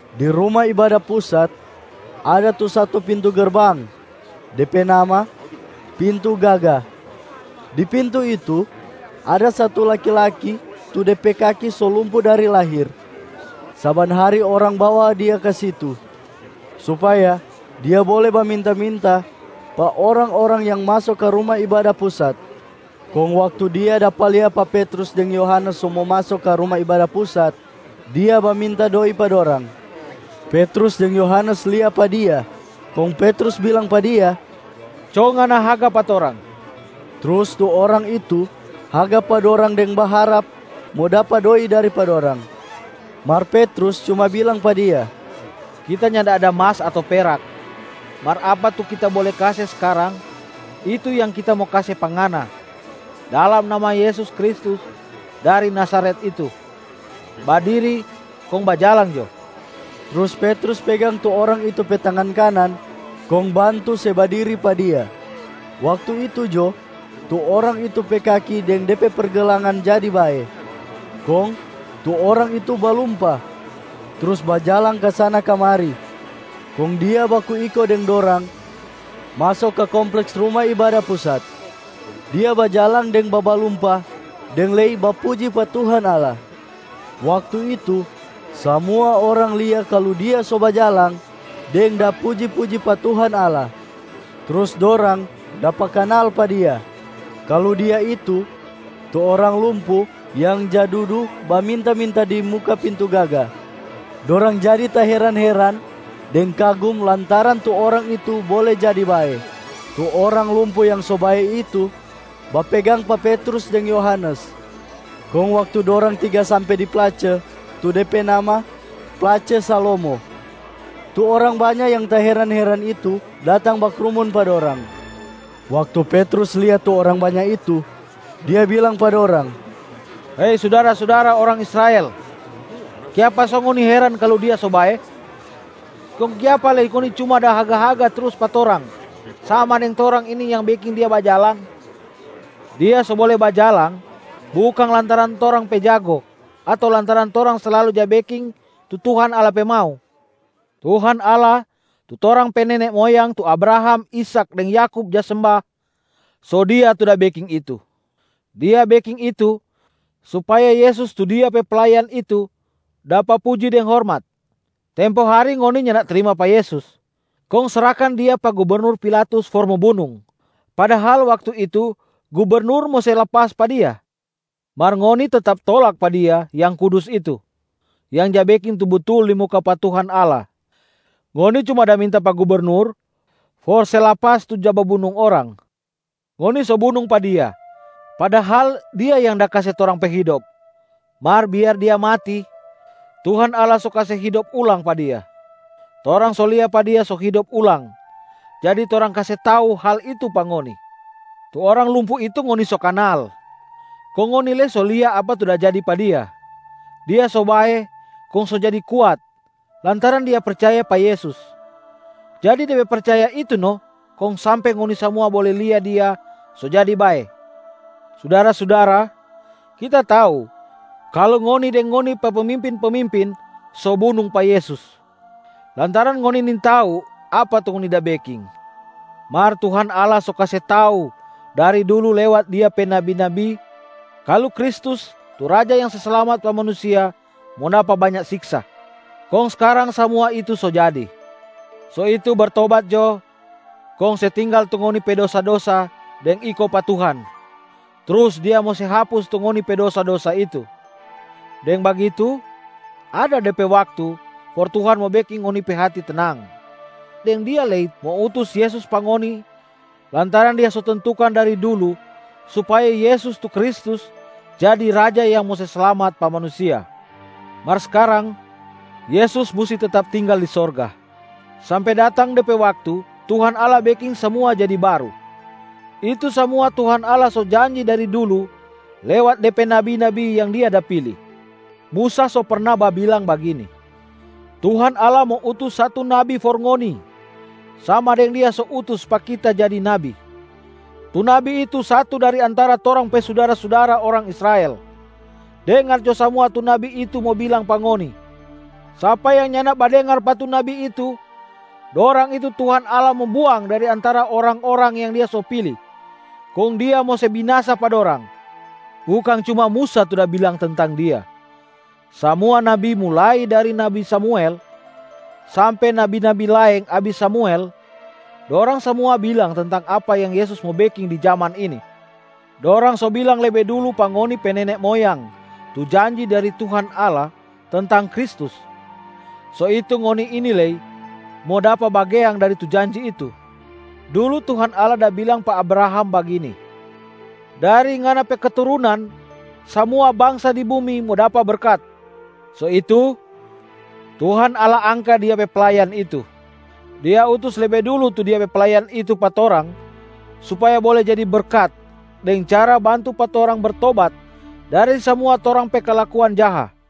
Di Ruma Ibada Pusat ada tu satu pintu gerbang, de pe nama ‘Pintu Gaga’. Di pintu itu, ada satu laki-laki tu de pe kaki so lumpu dari lahir. Saban hari orang bawa dia ka situ, supaya dia bole baminta-minta pa orang-orang yang maso ka Ruma Ibada Pusat. Kong waktu dia dapa lia pa Petrus deng Yohanes so mo maso ka Ruma Ibada Pusat, dia baminta doi pa dorang. Petrus deng Yohanes lia pa dia, kong Petrus bilang pa dia, “Co ngana haga pa torang!” Trus tu orang itu haga pa dorang deng baharap mo dapa doi dari pa dorang. Mar Petrus cuma bilang pa dia, “Kita nyanda ada mas ato perak. Mar apa tu kita bole kase skarang, itu yang kita mo kase pa ngana: dalam nama Yesus Kristus dari Nazaret itu, badiri kong bajalang jo!” Trus Petrus pegang tu orang itu pe tangan kanan kong bantu se badiri pa dia. Waktu itu jo tu orang itu pe kaki deng de pe pergelangan jadi bae. Kong tu orang itu balumpa trus bajalang kasana-kamari, kong dia baku iko deng dorang maso ka kompleks Ruma Ibada Pusat. Dia bajalang deng babalumpa deng lei bapuji pa Tuhan Allah. Waktu itu, samua orang lia kalu dia so bajalang deng da puji-puji pa Tuhan Allah. Trus dorang dapa kanal pa dia, kalu dia itu tu orang lumpu yang ja dudu baminta-minta di muka Pintu Gaga. Dorang jadi taheran-heran deng kagum lantaran tu orang itu bole jadi bae. Tu orang lumpu yang so bae itu bapegang pa Petrus deng Yohanes. Kong waktu dorang tiga sampe di place tu de pe nama ‘Place Salomo’, tu orang banya yang taheran-heran itu, datang bakrumun pa dorang. Waktu Petrus lia tu orang banya itu, dia bilang pa dorang, “Hei sudara-sudara orang Israel, kiapa so ngoni heran kalu dia so bae? Kong kiapa lei ngoni cuma da haga-haga trus pa torang sama deng torang ini yang beking dia bajalang? Dia so bole bajalang, bukang lantaran torang pe jago ato lantaran torang slalu ja beking tu Tuhan Allah pe mau. Tuhan Allah tu torang pe nene moyang tu Abraham, Ishak deng Yakub ja semba, so Dia tu da beking itu. Dia beking itu supaya Yesus tu Dia pe playan itu dapa puji deng hormat. Tempo hari ngoni nyanda trima pa Yesus kong srahkan Dia pa gubernur Pilatus for mo bunung, padahal waktu itu gubernur mo se lapas pa Dia. Mar ngoni tetap tolak pa Dia Yang Kudus itu, Yang Ja Beking Tu Butul di muka pa Tuhan Allah. Ngoni cuma da minta pa gubernur for se lapas tu ja babunung orang. Ngoni so bunung pa Dia, padahal Dia yang da kase torang pe hidop, mar biar Dia mati Tuhan Allah so kase hidop ulang pa Dia. Torang so lia pa Dia so hidop ulang, jadi torang kase tau hal itu pa ngoni. Tu orang lumpu itu ngoni so kanal, kong ngoni lei so lia apa tu da jadi pa dia. Dia so bae kong so jadi kuat lantaran dia percaya pa Yesus. Jadi de pe percaya itu no kong sampe ngoni samua bole lia dia so jadi bae. Sudara-sudara, kita tau kalu ngoni deng ngoni pe pemimpin-pemimpin so bunung pa Yesus lantaran ngoni nintau apa tu ngoni da beking. Mar Tuhan Allah so kase tau dari dulu lewat Dia pe nabi-nabi kalu Kristus tu Raja yang se slamat pa manusia mo dapa banya siksa, kong skarang samua itu so jadi. So itu bertobat jo kong se tinggal tu ngoni pe dosa-dosa deng iko pa Tuhan, trus Dia mo se hapus tu ngoni pe dosa-dosa itu. Deng bagitu, ada de pe waktu for Tuhan mo beking ngoni pe hati tenang, deng Dia lei mo utus Yesus pa ngoni lantaran Dia so tentukan dari dulu supaya Yesus tu Kristus jadi Raja yang mo se slamat pa manusia. Mar skarang, Yesus musti tetap tinggal di sorga, sampe datang de pe waktu Tuhan Allah beking samua jadi baru. Itu samua Tuhan Allah so janji dari dulu lewat De pe nabi-nabi yang Dia da pili. Musa so perna babilang bagini, ‘Tuhan Allah mo utus satu Nabi for ngoni, sama deng Dia so utus pa kita jadi nabi. Tu Nabi itu satu dari antara torang pe sudara-sudara orang Israel. Dengar jo samua tu Nabi itu mo bilang pa ngoni. Sapa yang nyanda badengar pa tu Nabi itu, dorang itu Tuhan Allah mo buang dari antara orang-orang yang Dia so pili kong Dia mo se binasa pa dorang.’ Bukang cuma Musa tu da bilang tentang Dia, samua nabi mulai dari nabi Samuel sampe nabi-nabi laeng abis Samuel, dorang samua bilang tentang apa yang Yesus mo beking di jaman ini. Dorang so bilang lebe dulu pa ngoni pe nene moyang tu janji dari Tuhan Allah tentang Kristus, so itu ngoni ini lei mo dapa bagean dari tu janji itu. Dulu Tuhan Allah da bilang pa Abraham bagini, ‘Dari ngana pe keturunan, samua bangsa di bumi mo dapa berkat.’ So itu, Tuhan Allah angka Dia pe playan itu, Dia utus lebe dulu tu Dia pe playan itu pa torang supaya bole jadi berkat deng cara bantu pa torang bertobat dari samua torang pe kalakuan jaha.”